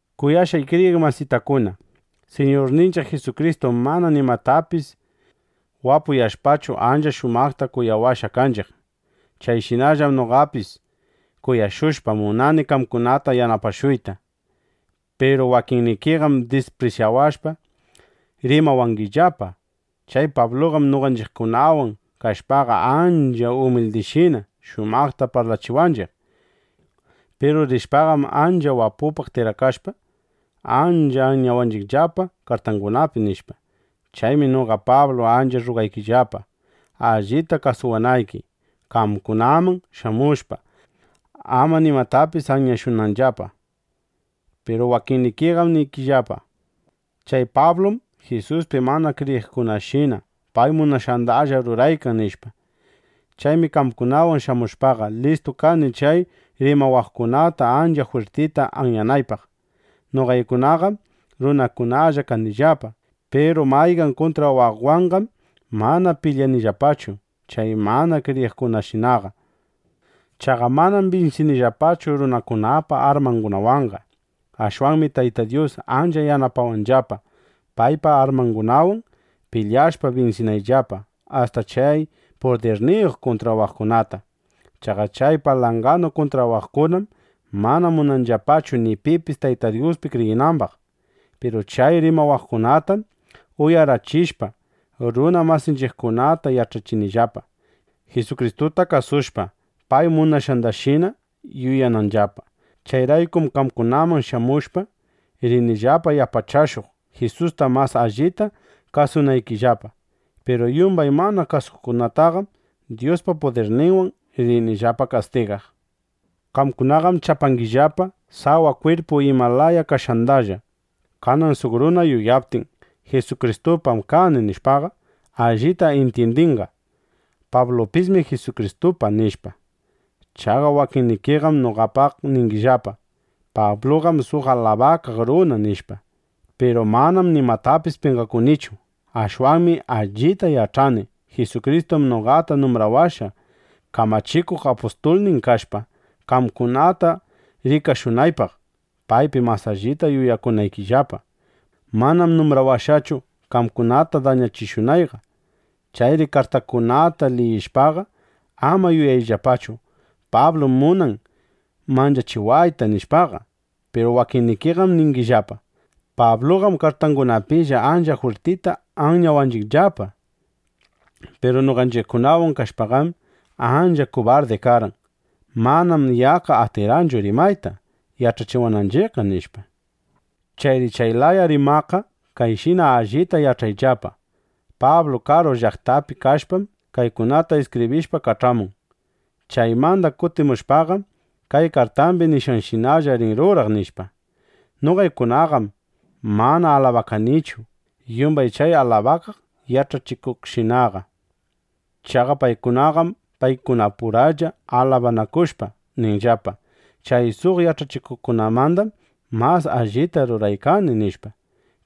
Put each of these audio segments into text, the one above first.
Kuyashqay kriyiq masitakuna, Siñurninchiq Jisukristum mana nimatapis wapuyashpachu, ancha shumaqta kuyawashqa kanchiq. (Chayshinallam noqapis kuyashushpa, munani qamkunata yanapashuyta.) Piru wakinnikiqam disprisyawashpa, rimawangillapa: “Chay Pabluqam noqanchiqkunawan kashpaqa, ancha umildishina shumaqta parlachiwanchiq. Piru rishpaqam, ancha wapupaq tikrakashpa, ancha anyawanchiqllapa kartangunapi”, nishpa. Chaymi noqa Pablu ancha rrugaykillapa, allita kasuwanayki, qamkunaman shamushpa, ama nimatapis anyashunayllapa. Piru wakinnikiqam ningillapa: “Chay Pablum Jisuspi mana kriyiqkunashina pay munashqandalla ruraykan”, nishpa. Chaymi qamkunaman shamushpaqa, listu kani chay rimawaqkunata ancha jwirtita anyanaypaq. Noqaykunaqam runakunalla kanillapa. Piru mayqan kuntrawaqwanqam mana pilyanillapachu chay mana kriyiqkunashinaqa. Chaqa manam binsinillapachu runakunapa armangunawanqa. Ashwanmi Tayta Dyus ancha yanapawanllapa, paypa armangunawan pilyashpa, binsinayllapa asta chay ancha pudirniyuq kuntrawaqkunata. Chaqa chay palanganu kuntrawaqkunam mana munanllapachu ni pipis Tayta Dyuspi kriyinambaq. Piru chay rimawaqkunatam uyarachishpa, runa masinchiqkunata yach'achinillapa, Jisukristuta kasushpa, pay munashqanshina yuyananllapa. Chayraykum qamkunaman shamushpa, rinillapa yanapashuq, Jisusta mas allita kasunaykillapa. Piru yumbay mana kasukuqtaqam (Dyuspa pudirninwan) rinillapa kastigaq. Qamkunaqam chapangillapa sawa kwirpu ima laya kashqandalla. Kanan suq runa yuyaptin: Jisukristupam kani, nishpaqa, allita intyindinqa: Pablupismi Jisukristupa, nishpa. Chaqa wakinnikiqam noqapaq ningillapa: Pabluqam suq alabakaq runa, nishpa. Piru manam nimatapis penqakunichu. Ashwanmi allita yach'ani: Jisukristum noqata numbrawashqa, kamachikuq apustulnin kashpa, qamkunata rikashunaypaq, paypi mas allita yuyakunaykillapa. Manam numbrawashqachu, qamkunata dañachishunayqa. Chayri kartaykunata liyishpaqa, ama yuyayllapachu: Pablum munan manchachiwayta, nishpaqa. Piru wakinnikiqam ningillapa: “Pabluqam kartangunapilla ancha jwirtita anyawanchiqllapa. Piru noqanchiqkunawan kashpaqam, ancha kubardi karqan. Manam yaqqa atirqanchu rimayta yach'achiwananchiqqa”, nishpa. Chayri chay laya rimaqqa kayshina allita yach'ayllapa: Pablu karu llaqtapi kashpam, kaykunata iskibrishpa kach'amun. Chaymanda kutimushpaqam, kay kartambi nishqanshinalla rin ruraq, nishpa. Noqaykunaqam mana alabakanichu yumbay chay alabakaq yach'achikuqshinaqa. Chaqa paykunaqam paykunapuralla alabanakushpa ninllapa: “Chay suq yach'achikuqmandam mas allita ruraykani”, nishpa.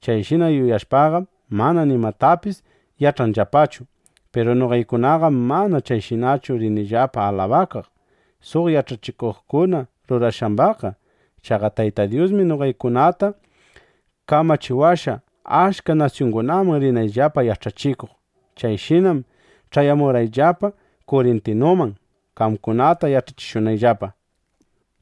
Chayshina yuyashpaqam, mana nimatapis yach'anllapachu. Piru noqaykunaqam mana chayshinachu rinillapa alabakaq suq yach'achikuqkuna rurashqambaqqa. Chaqa Tayta Dyusmi noqaykunata kamachiwashqa, achka nasyungunaman rinayllapa yach'achikuq. Chayshinam ch'ayamurqayllapa Kurintuman, qamkunata yach'achishunayllapa.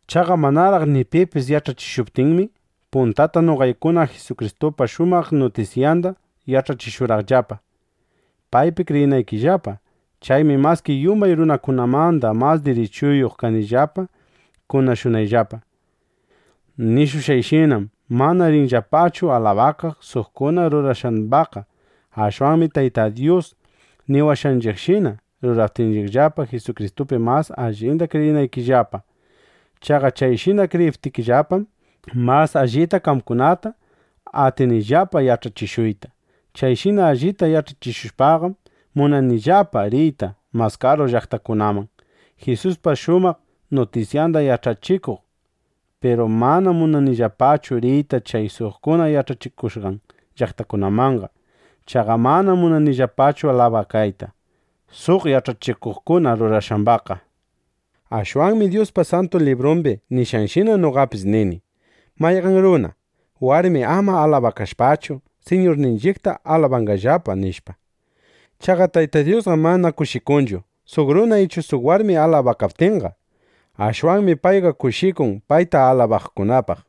Chaqa manaraq ni pipis yach'achishuptinmi, puntata noqaykuna Jisukristupa shumaq nutisyanda yach'achishurqaqllapa, paypi kriyinaykillapa. Chaymi maski yumbay runakunamanda mas dirichuyuq kanillapa kunashunayllapa. Nishushqayshinam mana rinillapachu alabakaq suqkuna rurashqambaqqa. Ashwanmi Tayta Dyus niwashqanshinalla ruraykanillapa, Jisukristupi mas allita kriyinaykillapa. Chaqa chayshina kriyiptikillapam, mas allita qamkunata atinillapa yach'achishuyta. Chayshina allita yach'achishushpaqam, munanillapa riyta mas karu llaqtakunaman, Jisuspa shumaq nutisyanda yach'achikuq. Piru manam munanillapachu riyta chay suqkuna yach'achikushqan llaqtakunamanqa. Chaqa manam munanillapachu alabakayta suq yach'achikuqkuna rurashqambaqqa. Ashwanmi Dyuspa Santu Librun nishqanshina noqapis nini: “Mayqan runa, warmi ama alabakashpachu, Siñurninchiqta alabanqallapa”, nishpa. Chaqa Tayta Dyusqam mana kushikunchu, suq runa ichu suq warmi alabakaptinqa. Ashwanmi payqa kushikun payta alabaqkunapaq.